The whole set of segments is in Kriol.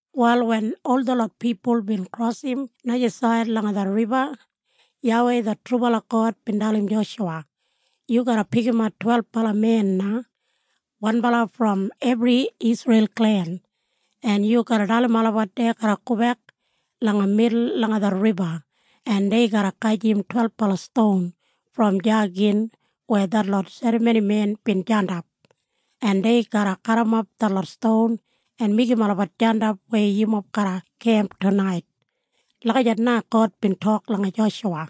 Wal wen ol detlot pipul bin krosim najasaid langa det riba, YAWEI det trubala God bin dalim Joshuwa, “Yu garra pikimat twelbala men na, wanbala brom ebri Isreil klen, en yu garra dalim olabat dei garra gobek langa midul langa det riba, en dei garra gajim twelbala ston brom deya gin weya detlot serramonimen bin jandap, en dei garra garrimap detlot ston en meigim olabat jandap weya yumob garra kemp tunait.” Lagijat na God bin tok langa Joshuwa.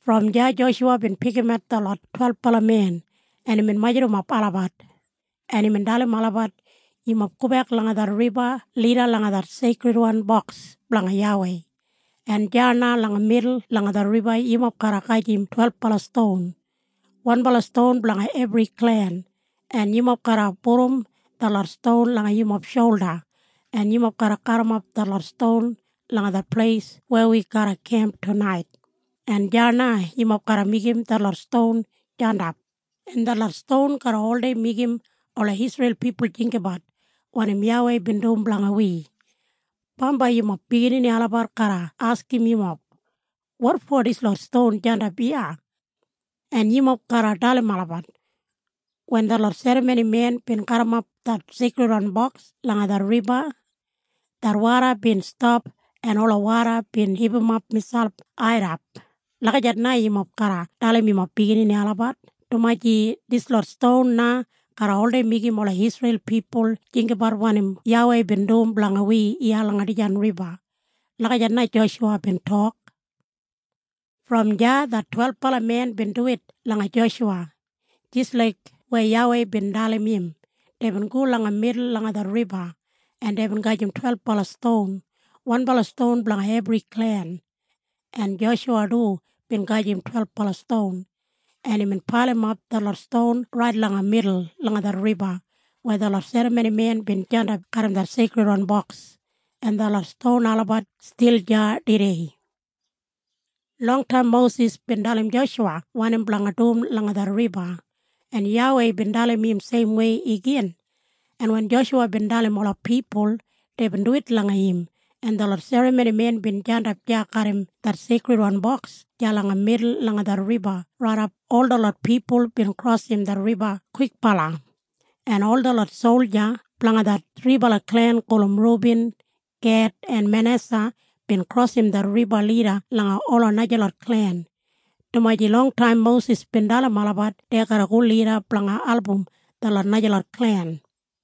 Brom deya Joshuwa bin pikimat detlot twelbala men, en imbin majurrumap olabat, en imbin dalim olabat, “Yumob gobek langa det riba lida langa det Seikridwan Boks blanga YAWEI, en deya na langa midul langa det riba yumob garra gajim twelbala ston, wanbala ston blanga ebri klen, en yumob garra pudum detlot ston langa yumob sholda en yumob garrimap detlot ston langa det pleis weya wi garra kemp tunait, en deya na yumob garra meigim detlot ston jandap, en detlot ston garra oldei meigim ola Isreil pipul jinggabat wanim YAWEI bin dum blanga wi. Bambai yumob biginini olabat garra askim yumob, ‘Wotfo dislot ston jandap iya?’ En yumob garra dalim olabat, ‘Wen detlot serramonimen bin garrimap det Seikridwan Boks langa det riba, det woda bin stap en ola woda bin hipimap miselp airrap.’ Lagijat na yumob garra dalim yumob biginini olabat, dumaji dislot ston na garra oldei meigim ola Isreil pipul jinggabat wanim YAWEI bin dum blanga wi iya langa dijan riba.” Lagijat na Joshuwa bin tok. Brom deya det twelbala men bin duwit langa Joshuwa jis laik weya YAWEI bin dalim im. Deibin go langa midul langa det riba, en deibin gajim twelbala ston, wanbala ston blanga ebri klen. En Joshuwa du bin gajim twelbala ston, en imbin pailimap detlot ston rait langa midul langa det riba weya detlot serramonimen bin jandap garram det Seikridwan Boks, en detlot ston olabat stil deya tudei. Longtaim Mosis bin dalim Joshuwa wanim blanga dum langa det riba, en YAWEI bin dalim im seimwei igin, en wen Joshuwa bin dalim ola pipul, deibin duwit langa im, en detlot serramonimen bin jandap deya garram det Seikridwan Boks deya langa midul langa det riba raidap ol detlot pipul bin krosim det riba kwikbala, en ol detlot solja blanga det thribala klen gulum Rubin, Ged en Manesa bin krosim det riba lida langa ola najalot klen, dumaji longtaim Mosis bin dalim olabat dei garra go lida blanga album detlot najalot klen.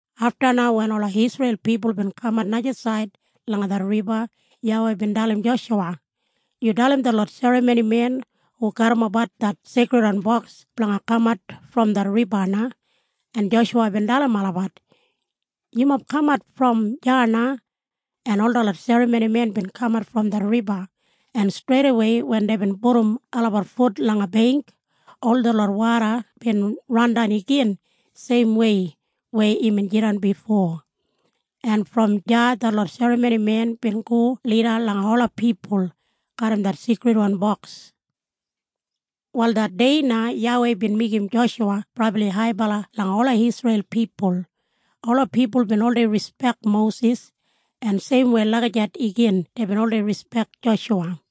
Afta na wen ola Isreil pipul bin kamat najasaid langa det riba, YAWEI bin dalim Joshuwa, “Yu dalim detlot serramonimen hu garrimapbat det Seikridwan Boks blanga kamat brom det riba na.” En Joshuwa bin dalim olabat, “Yumob kamat brom deya na!” En ol detlot serramonimen bin kamat brom det riba, en streidawei wen deibin pudum olabat fut langa beingk, ol detlot woda bin randan igin seimwei weya imbin jidan bifo, en brom deya detlot serramonimen bin go lida langa ola pipul garram det Seikridwan Boks. Wal det dei na YAWEI bin meigim Joshuwa brabli haibala langa ola Isreil pipul. Ola pipul bin oldei rispek Mosis, en seimwei lagijat igin deibin oldei rispek Joshuwa.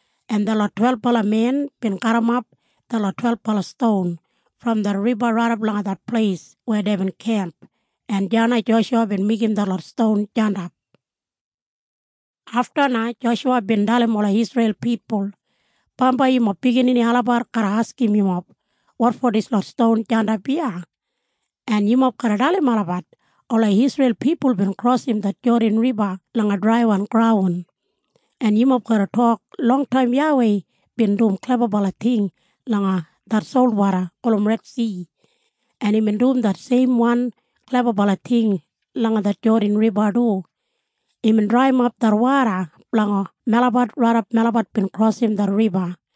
en detlot twelbala men bin garrimap detlot twelbala ston brom det riba raidap langa det pleis weya deibin kemp, en deya na Joshuwa bin meigim detlot ston jandap. Afta na Joshuwa bin dalim ola Isreil pipul, “Bambai yumob biginini olabat garra askim yumob, ‘Wotfo dislot ston jandap iya?’ En yumob garra dalim olabat, ‘Ola Isreil pipul bin krosim det Jodan Riba langa draiwan graun.’ En yumob garra tok, ‘Longtaim YAWEI bin dum klebabala ting langa det solwoda gulum Redsi, en imbin dum det seimwan klebabala ting langa det Jodan Riba du. Imbin draiyimap det woda blanga melabat raidap melabat bin krosim det riba.’